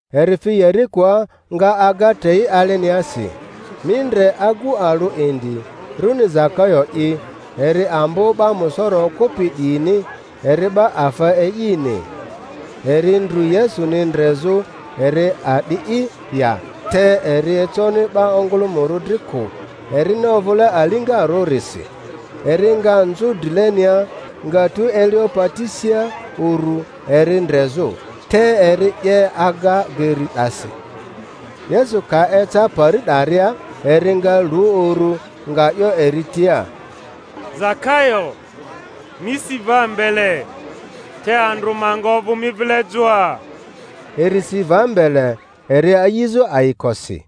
Eri fi Yerikoa, nga aga trei aleniasi. Mi ndre, agu alᴜ indi, runi Zakayo'i; eri ambo 'ba musoro okᴜpi 'diyini, eri 'ba afa e'ini. Eri ndrᴜ Yesuni ndrezᴜ eri a'di'i ya, te eri econi 'ba ongᴜlᴜmᴜrᴜ dri kᴜ, erini ovᴜle aliŋarᴜ-risi. Eri nga nzᴜ drilenia, nga tu elio pati sia uru eri ndrezᴜ, te eri 'ye aga geri 'dasi. Yesu ka eca pari 'daria, eri nga lu uru, nga 'yo eri tia, Zakayo, mi si va mbele; te andrᴜ ma nga ovᴜ mi vile joa. Eri si va mbele, eri a'izᴜ ayikosi.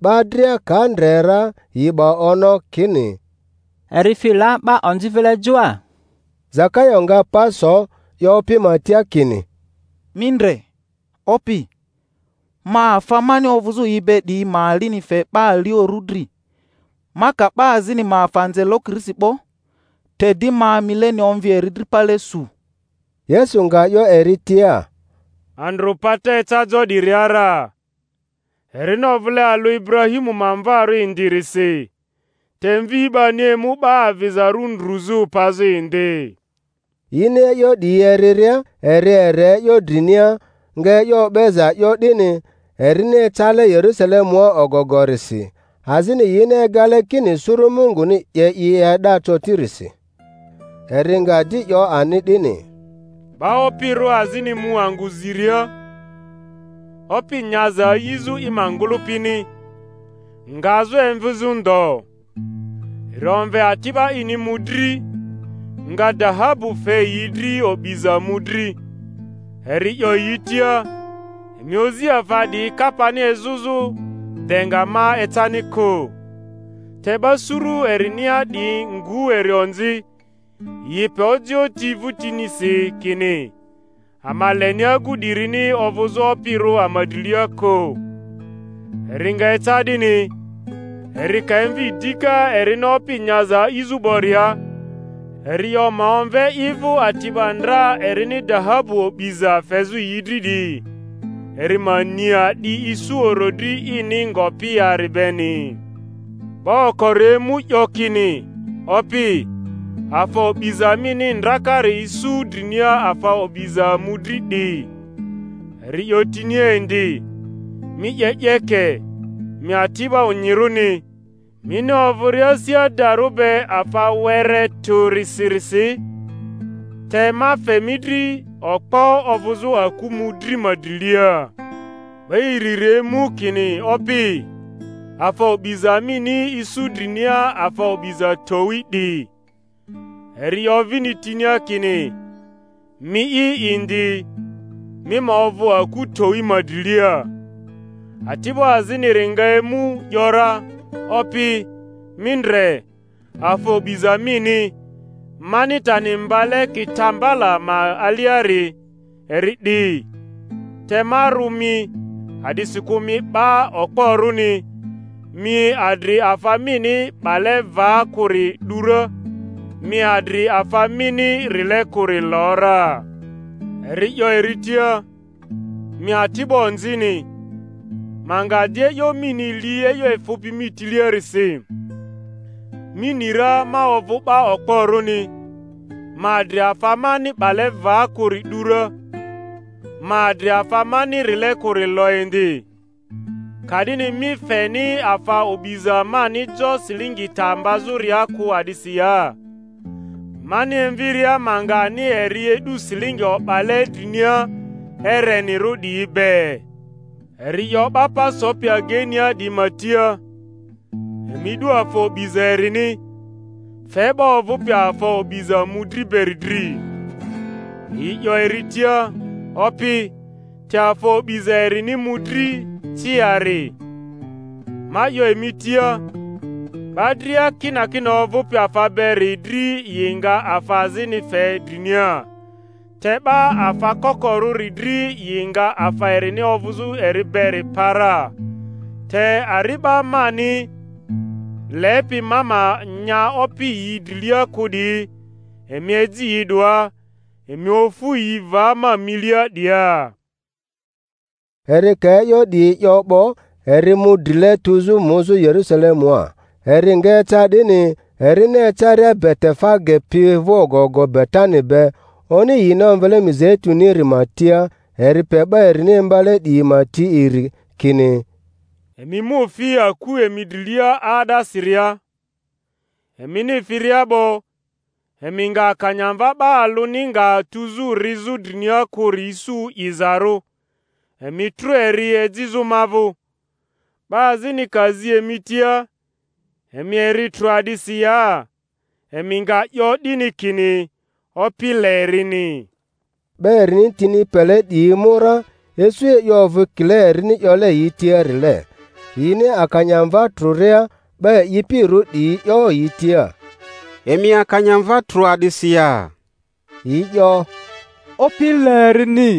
'Ba dria ka ndre ra, yi 'ba ono kini, Eri fi la 'ba onzi vile joa. Zakayo nga pa so, 'yo Opi ma tia kini, Mi ndre, Opi, ma afa mani ovᴜzᴜ yi be 'diyi ma alini fe 'ba aliorᴜ dri; ma ka 'ba azini ma afa nze lokirisi 'bo, te di ma mileni omvi eri dri pale su. Yesu nga 'yo eri tia, Andrᴜ pata eca jo 'diria ra, erini ovᴜle alᴜ Iburahimu ma mvarᴜ indirisi. Te Mvi 'bani emu 'ba avizarᴜ ndruzᴜ pazᴜ indi. Yini e'yo 'diyi eriria, eri ere e'yo drinia, nga e'yo o'beza 'yo 'dini, erini ecale Yerusalemua ogogorisi, azini yini egale kini suru Munguni 'ye i e'da cotirisi. Eri nga di 'yo ani 'dini, Ba opirᴜ azini mu angᴜ ziria, opi nyaza ayizᴜ i ma ngᴜlᴜpini, ngazᴜ emvizᴜ ndo. Eri omve ati'ba ini mᴜdri, nga dahabu fe yi dri o'biza mᴜdri, eri 'yo yi tia, Emi ozi afa 'diyi kapani ezᴜzᴜ de nga ma ecani kᴜ. Te 'ba suru erinia 'diyi ngu eri onzi, yi pe ojioᴜ ti vᴜtinisi, kini, Ama leni agu 'dirini ovᴜzᴜ opirᴜ ama drilia kᴜ. Eri nga eca 'dini, eri ka emvi dika erini opi nyaza a'izᴜ 'boria, eri 'yo ma omve i vᴜ ati'ba ndra erini dahabu o'biza fezᴜ yi dri 'diyi, eri ma ni a'di isu orodri ini ngopi yari beni. 'Ba okori emu 'yo kini, Opi, afa o'biza mini ndrakari isu drinia afa o'biza mᴜdri 'di. Eri 'yo tinia indi, Mi 'ye 'yeke, mi ati'bo onyirᴜni! Mini ovᴜria asi adarᴜ be afa were tᴜrisi-risi, te ma fe mi dri okpo ovᴜzᴜ aku mᴜdri ma drilia. 'Ba iriri emu, kini, Opi, afa o'biza mini isu drinia afa o'biza towi 'di. Eri 'yo vini tinia kini, Mii'i indi, mi ma ovᴜ aku towi ma drilia. Ati'bo aziniri nga emu, ‘yora, Opi, mi ndre, afa o'biza mini, mani tani mbale kitambala ma aliari, eri 'di; te ma rᴜ mi, a'disikᴜ mi 'ba okporᴜni; mi adri afa mini 'bale va kᴜri 'du ra, mi adri afa mini rile kᴜri lo ra. Eri 'yo eri tia, Mi ati'bo onzini, ma nga di e'yo mini li e'yo efᴜpi mi tiliarisi! Mi ni ra ma ovᴜ 'ba okporᴜni, ma adri afa mani 'bale va kᴜri 'du ra, ma adri afa mani rile kᴜri lo indi; ka'dini mi feni afa o'biza mani jo silingi ta mbazᴜria kᴜ a'disi ya, mani emviria ma nga ani eri e'du silingi o'bale drinia erenirᴜ 'diyi be? Eri 'yo 'ba pa sopi ageinia 'diyi ma tia, Emi 'du afa o'biza erini, fe 'ba ovᴜpi afa o'biza mᴜdri beri dri. Yi 'yo eri tia, Opi, te afa o'biza erini mᴜdri ciari. Ma 'yo emi tia, 'Ba dria kinakina ovᴜpi afa beri dri yi nga afa azini fe drinia; te 'ba afa kokorᴜri dri yi nga afa erini ovᴜzᴜ eri beri pa ra. Te ari'ba mani lepi ma ma nya opi yi drilia kᴜ 'diyi, emi eji yi 'doa, emi ofu yi va ma milia 'dia. Eri ka e'yo 'diyi 'yo 'bo, eri mu drile, tuzᴜ muzᴜ Yerusalemua. Eri nga eca 'dini, erini ecaria Betefage pi vᴜ ogogo Betani be, oni yini omvele Mizeitᴜniri ma tia, eri pe 'ba erini imbale 'diyi ma ti iri, kini, Emi mu fi aku emi drilia 'aa'dasiria; emini firia 'bo emi nga akanyamva 'ba alᴜni nga tuzᴜ rizᴜ drinia kᴜri isu 'izarᴜ; emi trᴜ eri ejizᴜ ma vᴜ. 'Ba azini ka zi emi tia, Emi eri trᴜ a'disi ya? emi nga 'yo 'dini kini, Opi le erini. 'Ba erini tini pele 'diyi mu ra, isu e'yo ovᴜ kile erini 'yole yi tiarile. Yini akanyamva trᴜria, 'ba e'ipirᴜ 'diyi 'yo yi tia, Emi akanyamva trᴜ a'disi ya? Yi 'yo, Opi le erini.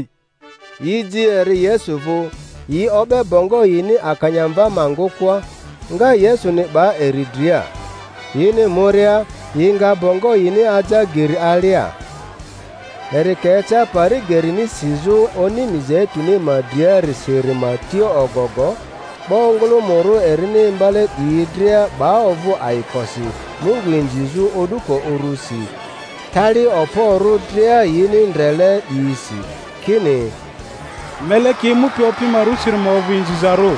Yi ji eri Yesu vᴜ; yi o'be bongo yini akanyamva ma ngᴜkᴜa, nga Yesuni 'ba eri dria. Yini muria, yi nga bongo yini aja geri alia. Eri ka eca pari gerini sizᴜ oni Mizeituni ma dria-risiri ma tia ogogo, 'ba ongᴜlᴜmᴜrᴜ erini imbale 'diyi dria 'ba ovᴜ ayikosi Mungu inzizᴜ o'duko urusi, tali okporᴜ dria yini ndrele 'diyisi, kini, Meleki emupi Opi ma rᴜsiri ma ovᴜ inzizarᴜ!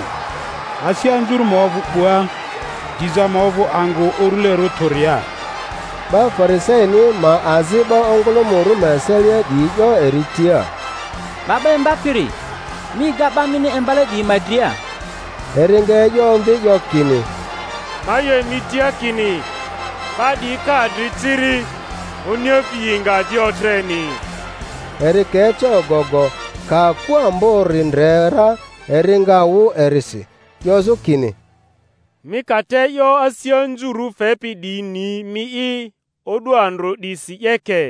Asi anzurᴜ ma ovᴜ 'bua, diza ma ovᴜ angᴜ urulerᴜ tᴜria! 'Ba Fari-saini ma azi 'ba ongᴜlᴜmᴜrᴜ ma eselia 'diyi 'yo eri tia, 'Ba 'ba Imbapiri, mi ega 'ba mini imbale 'diyi ma dria. Eri nga e'yo omvi, 'yo kini, Ma 'yo emi tia kini, 'ba 'diyi ka adri ciri, oniefi yi nga di otreni. Eri ka eca ogogo, ka aku ambori ndre ra, eri nga wᴜ erisi, 'yozᴜ kini, Mi ka te e'yo asi anzurᴜ fepi 'diyi ni mi'i o'du andrᴜ 'disi, 'yeke!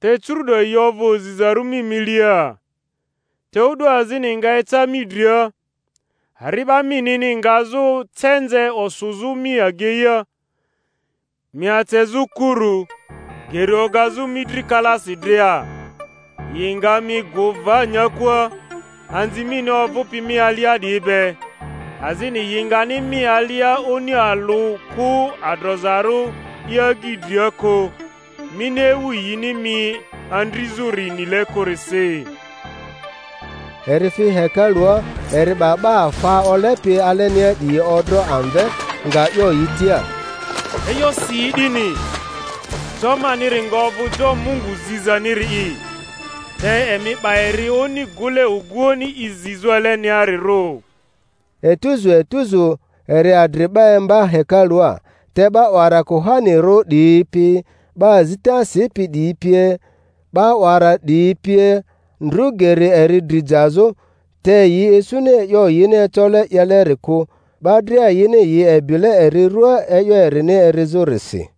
Te curu’do yi ovᴜ ozizarᴜ mi milia. Te o'du azini nga eca mi dria, ari'ba minini ngazᴜ cenze osᴜzᴜ mi ageia, mi acezᴜ kuru, geri ogazᴜ mi dri kalaasi dria, yi nga mi gᴜ va nyakua, anzi mini ovᴜpi mi alia 'diyi be, azini yi ngani mi alia oni alᴜ kᴜ adrozarᴜ i agyi dria kᴜ; mini ewu yini mi andrizᴜri nile kᴜrisi. Eri fi hekalua, eri 'ba 'ba afa olepi alenia 'diyi odro amve, nga 'yo yi tia, E'yo si yi 'dini, Jo maniri nga ovᴜ jo Mungu zizaniri'i; te emi 'ba eri oni gᴜle oguoᴜni i zizᴜ aleniarirᴜ. Etuzu etuzu eri adri 'ba imba hekalua. Te 'ba 'wara kuhanirᴜ 'diyi pi, 'ba azita sipi 'diyi pie. 'ba 'wara 'diyi pie ndru geri eri dri jazᴜ; te yi isuni e'yo yini ecole 'yeleri kᴜ, 'ba dria yini yi ebile eri ruaa e'yo erini erizᴜrisi.